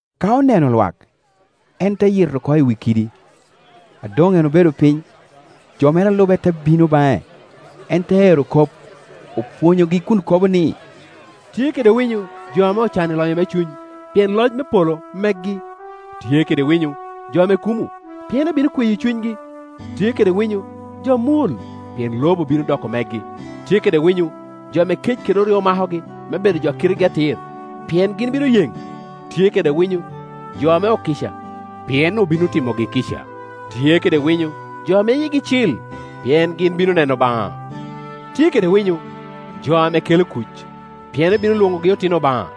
Ka oneno lwak, en te yito oko i wi kidi. A doŋ en obedo piny, jo mere a lube te bino baŋe. En te ero kop, opwonyogi kun kobo ni. “Tye kede winyo, jo ame ocan i lonyo me cuny, pien loc me polo megi. “Tye kede winyo, jo ame kumo, pien obino kweyo cunygi. “Tye kede winyo, jo ame mwol, pien lobo bino doko megi. “Tye kede winyo, jo ame kec kede oryo makogi me bedo jo a kitegi atir, pien gin bino yeŋ. “Tye kede winyo, jo ame okica, pien obino timogi kica. “Tye kede winyo, jo ame yigi cil, pien gin bino neno Obaŋa. “Tye kede winyo, jo ame kelo kuc, pien obino lwoŋogi otino Obaŋa.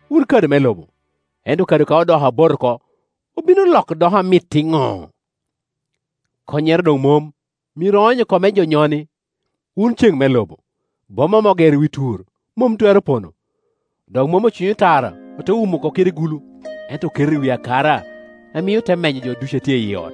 “Wun kado me lobo; ento kado ka odoko abot oko, obino loko doko amit iŋo? Konnyere doŋ mom; myero oony oko me jo nyoni. “Wun ceŋ me lobo. Boma ame ogero i wi tur mom twero pono. Dok mom ocwinyo tara ote dok wumo oko kede gulu; ento oketo i wi akara, a mio te menyo jo ducu a tye i ot.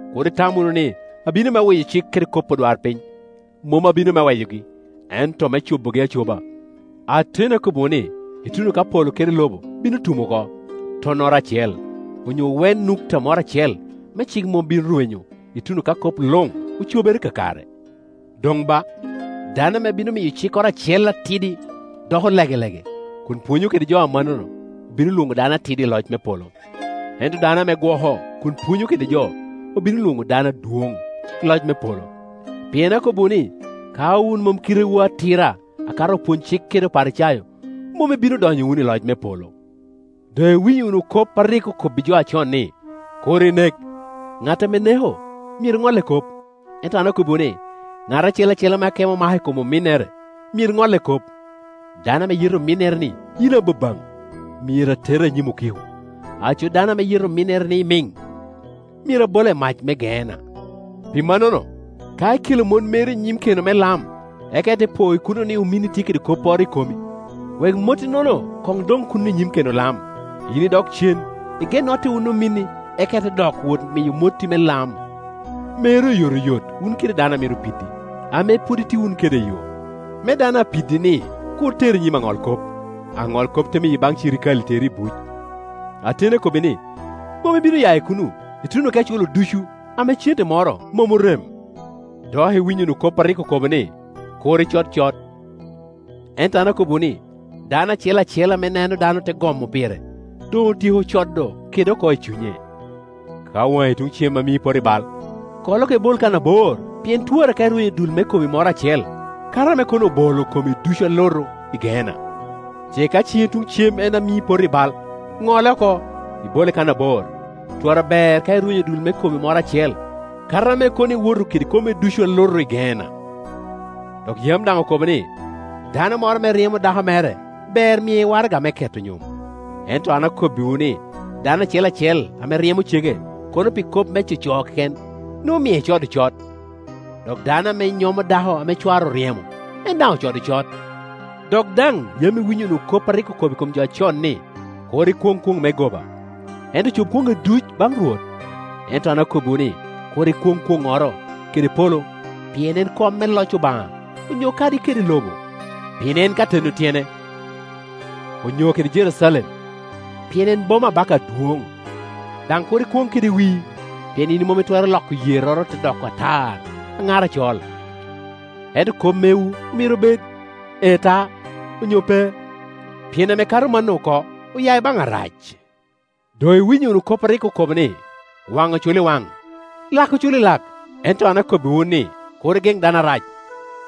“Kur itam wunu ni abino me weyo cik kede kop odwarpiny; mom abino me weyogi, ento me cobogi acoba. Ateni akobbiwu ni, ituno ka polo kede lobo bino tum oko, tunnoro acel, onyo wen nukuta moro acel me cik mom bino rwenyo, ituno ka kop luŋ ocobere kakare. Doŋ ba, dano ame bino miyo cikkoro acel atidi doko legelege, kun pwonyo kede jo amannono, obino lwoŋe dano atidi i loc me polo; ento dano ame gwoko, kun pwonyo kede jo, obino lwoŋe dano adwoŋ i loc me polo. Pien akobbiwu ni, ka wun mom kitewu atira akato opwony-cik kede Oparicayo, mom ibino donyo wunu i loc me polo. “Doŋ iwinyo wunu kop a rik okobbi jo acon ni, ‘Kur inek; ŋat ame neko nek myero ŋolle kop.’ Ento an okobbiwu ni, ŋat acel acel ame akemo omako i kom ominnere myero ŋolle kop: dano ame yeto ominnere ni, ‘Yin ababaŋ’ myero atera i nyim okiko, aco dano ame yeto ominnere ni, ‘Imiŋ’ myero abola i mac me Geena. Pi mannono, ka ikelo motti meri i nyim keno me lam, eka ite po i kuno ni ominni tye kede kopporo i komi, wek motti-nono koŋ doŋ kuno i nyim keno lam, yin idok cen, ige notte wun ominni, eka ite dok wot miyo motti me lam. Mer oyotoyot wun kede dano a mito pidi, ame pwod itye wunu kede i yo, me dano a pidi-ni kur teri i nyim aŋolkop, aŋolkop te miyi baŋ cirikale teri i buc. Ateni akobbi ni, mom ibino ya i kuno, ituno ka iculo ducu, ame cente moro mom orem. “Dok iwinyo wunu kop a rik okobo ni, ‘Kur icod cot.’ Ento an akobbiwu ni, dano acel ame neno dannoro te gomo pire, doŋ otyeko code kede oko i cunye. Ka waŋi tuŋ cem en amii ipoto i bal, kole oko, ibole kan abor: pien twara ka irwenyo dul me komi moro acel, kato ame kono obolo komi ducu alutu i Geena. Ce ka ciŋi tuŋ cem en ame mii ipoto i bal, ŋole oko, ibole kan abor, twara ber ka irwenyo dul me komi moro acel, kato ame kono iwoto kede komi ducu alutu i Geena. “Dok yam daŋ okobo ni, ‘Dano moro ame ryemo dako mere, ber mie waraga me keto nyom.’ Kor. 7.10-11Ento an akobbiwu ni, dano acel acel ame ryemo cege, kono pi kop me coco keken, nwoŋo omie eeodo cot; dok dano ame nyomo dako ame cware oryemo, en daŋ ocodo cot. “Dok daŋ yam iwinyo wunu kop a rik okobbi jo acon ni, ‘Kur ikwoŋ kwoŋ me goba, ento cob kwoŋŋi ducu baŋ Rwot.’ Ento an akobbiwu ni, kur ikwoŋ kwoŋoro, kede polo, pien en kom me loc Obaŋa, onyo kadi kede lobo, pien en ka teno tyene, onyo kede Jerucalem, pien en boma Abaka adwoŋ. Daŋ kur ikwoŋ kede wii, pien yin mom itwero loko yerroro te doko atar aŋar acol. Ento kop mewu myero obed ‘Ee ta’ onyo ‘Pe’; pien ame kato mano oko ya i baŋ Arac. “Doŋ iwinyo wunu kop a rik oko bo ni, ‘Waŋ oculo i wan, lak oculo i lak.’ Ento an akobbiwu ni, kur igeŋ dano dano arac;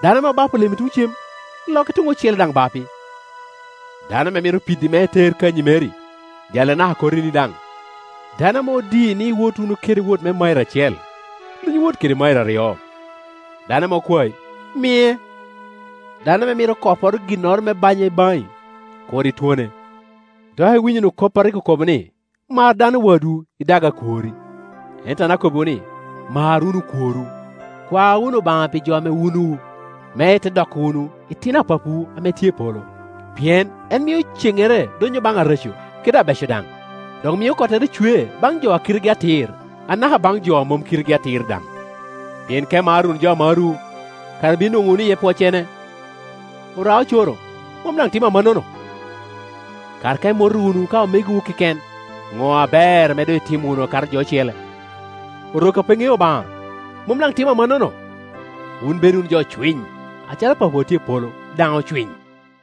dano ame obapo lemi tuŋ cem, lokke tuŋ ocele daŋ obapi; dano ame mito pidi me eter kanyi meri, jalle anaka kotini daŋ. Dano ame odii ni iwot wunu kede wot me mairo acel, luny wot kede mairo aryo. Dano ame kwai, mie; dano ame mito koporo ginnoro me banya baŋi, kur itwonne. “Dok iwinyo wunu kop a rik okobo ni, ‘Mar dano wadwu, idag akworri.’ Ento an akobbiwu ni, mar wunu okworwu, kwa wunu Obaŋa pi jo ame wunuwu, me ite doko wunu itino a Papawu ame tye i polo. Pien en mio cennere donnyo baŋ areco kede o abeco daŋ, dok mio kottere cwe baŋ jo a kitegi atir, anaka baŋ jo a mom kitegi atir daŋ. Pien ka imaro wunu jo a marowu, kara ibino nwoŋo wunu iye pwoccene? Ora-ocoro mom daŋ timo amannono? Kara ka imoto wunu ka omegowu keken, ŋo aber ame doŋ itimo wunu akato jo ocele? Orok a pe ŋeo Obaŋa mom daŋ timo amannono? Wun bed wunu jo ocwiny acalo Papawu a tye i polo daŋ ocwiny.